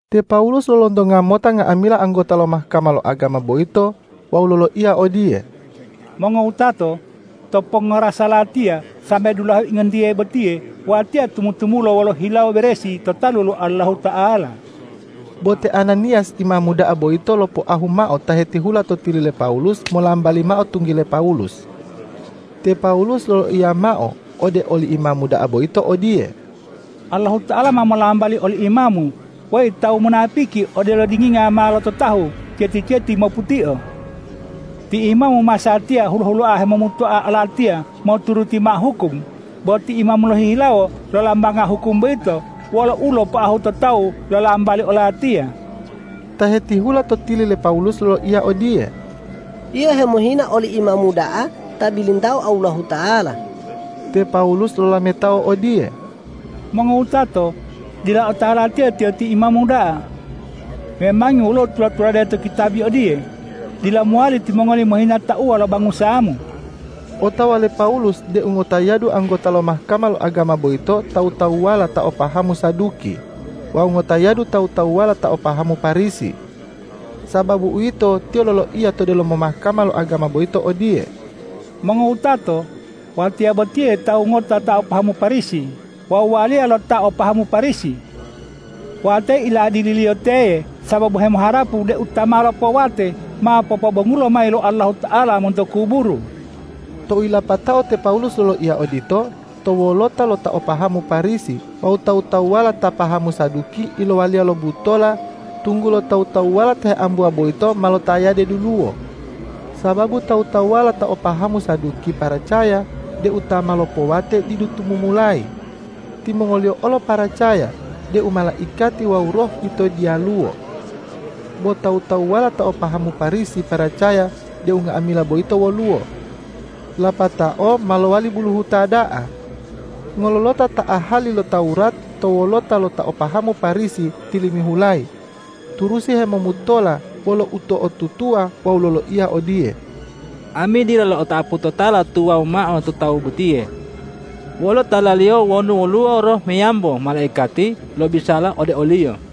Te Pawulus lolontonga mota nga'amila anggota lo Mahkama lo agama boyito wawu loloiya odiye,”Mongowutato, to pongorasa latiya sambe dulahe ingontiye botiye watiya tumu-tumula wolo hilawo beresi to talu lo Allahuta'ala.” Bo te Ananiyas imamu da'a boyito lopoahu mao ta hetihula to tili le Pawulus molambali mao tunggile Pawulus. Te Pawulus loloiya mao ode oli imamu da'a boyito odiye,”Allahuta'ala ma molambali oli imamu, weyi tawu munapiki odelo dinginga ma lototahu ceti-ceti moputio! Ti imamu masatiya hulo-huloa hemomutoa olatiya moturuti mao hukum, bo ti imamu lohihilawo lolambanga hukum boyito wolo ulopoahu to tawu lolambali olatiya.” Ta hetihula to tili le Pawulus loloiya odiye,”Yio hemohina oli imamu da'a ta bilintao Allahuta'ala.” Te Pawulus lolametao odiye,”Mongowutato, dila otawa latiya tiyo ti imamu da'a. Memangi woluwo tula-tulade to kitabi odiye, ’Dila mowali timongoli mohina tauwa lo bangusamu.’” Otawa le Pawulus deu ngotayadu anggota lo Mahkama lo agama boyito tawu-tawuwala ta o pahamu Saduki wawu ngotayadu tawu-tawuwala ta o pahamu Parisi. Sababu uwito, tiyo loloiya to delomo Mahkama lo agama boyito odiye,”Mongowutato, watiya botiye tawu ngota ta o pahamu Parisi wawu waliya lo ta o pahamu Parisi. Watiya iladililiyo teye sababu hemoharapu deu ta ma lopowate ma popobongulo mayi lo Allahuta'ala monto kuburu.” Tou yilapatao te Pawulus loloiya odito, to wolota lo ta o pahamu Parisi wawu tawu-tawuwala ta pahamu Saduki ilowaliya lo butola, tunggulo tawu-tawuwala ta heambuwa boyito ma lotayade duluwo. Sababu tawu-tawuwala ta o pahamu Saduki paracaya deu ta ma lopowate didu tumumulayi. Timongoliyo olo paracaya deu malaikati wawu roh yito diyaluwo. Bo tawu-tawuwala ta o pahamu Parisi paracaya deu nga'amila boyito woluwo. Lapatao ma lowali buluhuta da'a. Ngololota ta ahali lo Tawurat to wolota lo ta o pahamu Parisi tilimihulayi turusi hemomutola wolo uto'otutuwa wawu loloiya odiye,”Ami dila lo'otapu totala tuwawu mao to tawu botiye! Wolo talaliyo wonu woluwo roh meyambo malaikati lobisala ode oliyo!”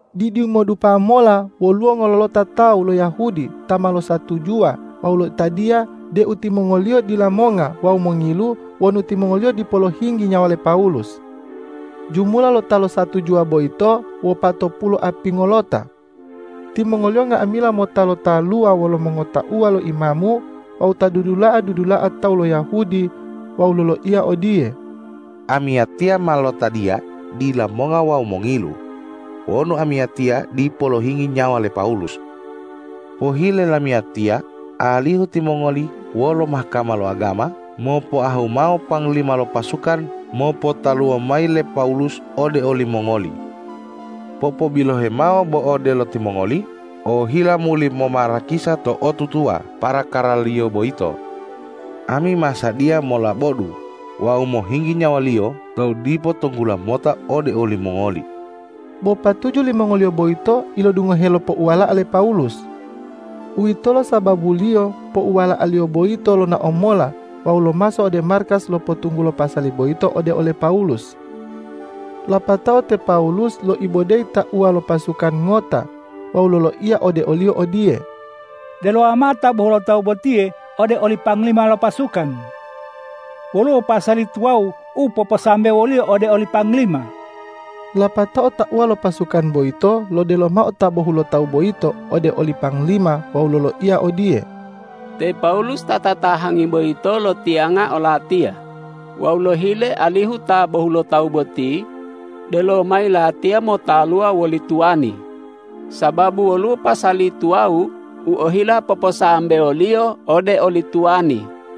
Didimodupa mola woluwo ngololota tawu lo Yahudi ta ma losatujuwa wawu lotadiya deu timongoliyo dila monga wawu mongilu wonu timongoliyo dipo lohinggi nyawa le Pawulus. Jumula lo ta losatujuwa boyito wopatopulu apingolota. Timongoliyo nga'amila mota lotaluwa wolo mongotauwa lo imamu wawu ta dudula'a-dudula'a tawu lo Yahudi wawu loloiya odiye,”Amiyatiya ma lotadiya dila monga wawu mongilu wonu amiyatiya dipo lohinggi nyawa le Pawulus. Pohile lamiyatiya alihu timongoli wolo Mahkama lo agama mopoahu mao panglima lo pasukan mopotaluwo mayi le Pawulus ode olimongoli. Popobilohe mao bo odelo timongoli ohila muli momarakisa to'otutuwa parakaraliyo boyito. Ami ma sadiya molabodu wawu mohinggi nyawaliyo tou dipo tunggula mota ode olimongoli.” Bo patuju limongoliyo boyito ilodungohe lo pouwala'a le Pawulus. Uwitolo sababuliyo pouwala'aliyo boyito lonao mola wawu lomaso ode markas lopotunggulo pasali boyito ode ole Pawulus. Lapatao te Pawulus loibodeyi tauwa lo pasukan ngota wawu loloiya ode oliyo odiye,”Delowa mao ta bohulotawu botiye ode oli panglima lo pasukan. Woluwo pasali tuwawu u poposambewoliyo ode oli panglima.” Lapatao tauwa lo pasukan boyito lodelo mao ta bohulotawu boyito ode oli panglima wawu loloiya odiye,”Te Pawulus ta tatahangi boyito lotiyanga olatiya wawu lohile alihu ta bohulotawu boti delo mayi latiya motaluwa woli tuwani, sababu woluwo pasali tuwawu u ohila poposambewoliyo ode oli tuwani.”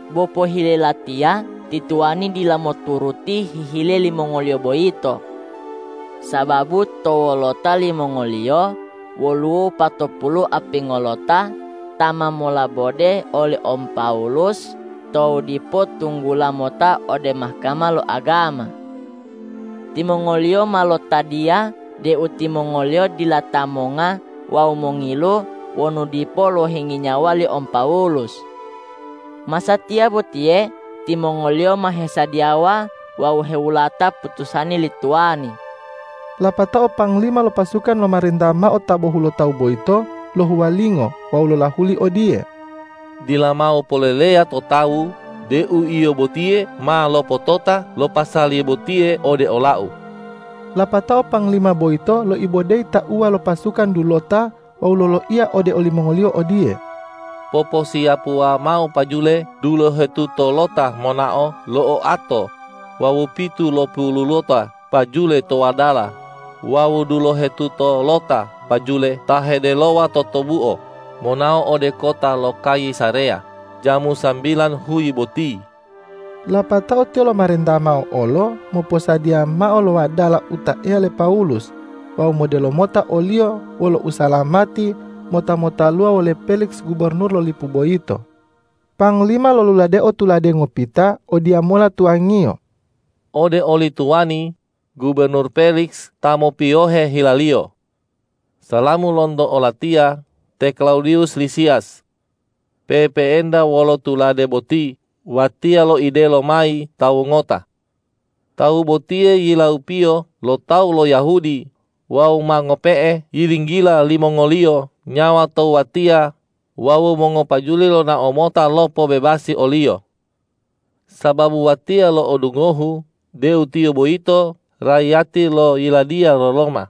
Bo pohile latiya ti tuwani dila moturuti hihile limongoliyo boyito. Sababu to wolota limongoliyo woluwo wopatopulu apingolota ta ma molabode oli om Pawulus tou dipo tunggula mota ode Mahkama lo agama. Timongoliyo ma lotadiya deu timongoliyo dila ta monga wawu mongilu wonu dipo lohinggi nyawa li om Pawulus. Masatiya botiye timongoliyo ma hesadiyawa wawu hewulata putusani li tuwani.” Lapatao panglima lo pasukan lomarenta mao ta bohulotawu boyito lohuwalingo wawu lolahuli odiye,”Dila mao poleleya to tawu deu yio botiye ma lopotota lo pasali botiye ode olau.” Lapatao panglima boyito loibodeyi tauwa lo pasukan dulota wawu loloiya ode olimongoliyo odiye,”Poposiyapuwa mao pajule dulohetutolota monao lo oato wawu pitulopululota pajule to wadala wawu dulohetutolota pajule ta hedelowa totobuo monao ode kota lo Kayisareya jamu sambilan huyi boti.” Lapatao tiyo lomarenta mao olo moposadiya mao lo wadala u taeya le Pawulus wawu modelo mota oliyo wolo usalamati mota motaluwa wole Peliks gubornur lo lipu boyito. Panglima loluladeo tulade ngopita odiyamola tuwangiyo, ”Ode oli tuwani, gubornur Peliks ta mopiyohe hilaliyo. Salamu lonto olatiya, te Klawudiwus Lisiyas. Pe'epe'enta wolo tulade boti watiya loidelo mayi tawu ngota. Tawu botiye yilaupiyo lo tawu lo Yahudi wawu ma ngope'e yilinggila limongoliyo nyawa tou watiya wawu mongopajule lonao mota lopobebasi oliyo. Sababu watiya lo'odungohu deu tiyo boyito raiyati lo yiladiya lo Roma.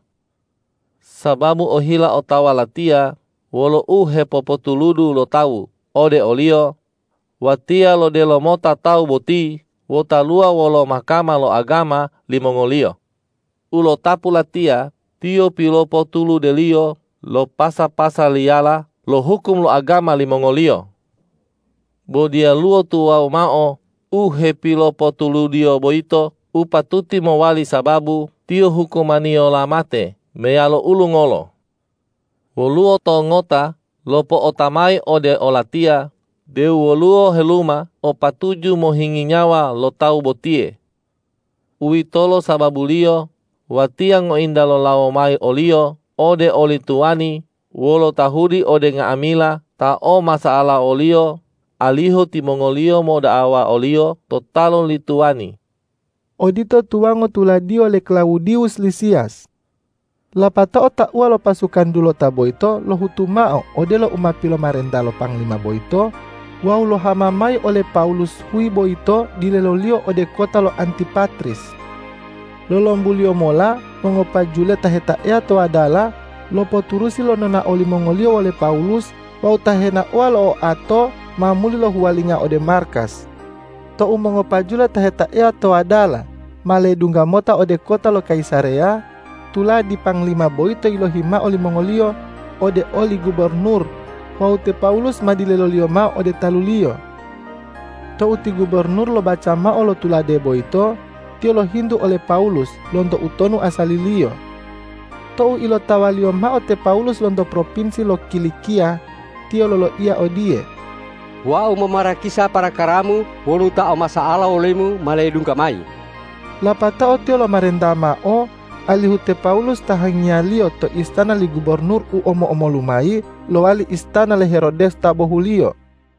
Sababu ohila otawa latiya wolo u hepopotuludu lo tawu ode oliyo, watiya lodelo mota tawu boti lotaluwa wolo Mahkama lo agama limongoliyo. U lotapu latiya tiyo pilopotuludeliyo lo pasa-pasaliyala lo hukum lo agama limongoliyo. Bo diyaluwo tuwawu mao u hepilopotuludiyo boyito u patuti mowali sababu tiyo hukumaniyola mate meyalo ulungolo. Woluwo tawu ngota lopo'ota mayi ode olatiya deu woluwo heluma o patuju mohinggi nyawa lo tawu botiye. Uwitolo sababuliyo watiya ngointa lolawo mayi oliyo ode oli tuwani wolo tahuli ode nga'amila ta o masa'ala woliyo, alihu timongoliyo moda'awa oliyo to talu li tuwani.” Odito tuwango tuladiyo le Klawudiwus Lisiyas. Lapatao tauwa lo pasukan dulota boyito lohutu mao odelo u ma pilomarenta lo panglima boyito wawu lohama mayi ole Pawulus huyi boyito dileloliyo ode kota lo Antipatris. Lolombuliyo mola mongopajule ta hetaeya to wadala lopoturusi lo nonao limongoliyo wole Pawulus wawu ta henaowa lo oato ma muli lohuwalinga ode markas. Tou mongopajule ta hetaeya to wadala ma ledungga mota ode kota lo Kayisareya, tuladi panglima boyito yilohi mao limongoliyo ode oli gubornur wawu te Pawulus ma dileloliyo mao ode taluliyo. Tou ti gubornur lobaca mao lo tulade boyito, tiyo lohintu ole Pawulus lonto utonu asaliliyo. Tou ilotawaliyo mao te Pawulus lonto propinsi lo Kilikiya, tiyo loloiya odiye,”Wau momarakisa parakaramu wonu ta o masa'ala wolemu ma ledungga mayi.” Lapatao tiyo lomarenta mao alihu te Pawulus tahangiyaliyo to istana li gubornur u omo-omolu mayi lowali istana le Herodes ta bohuliyo.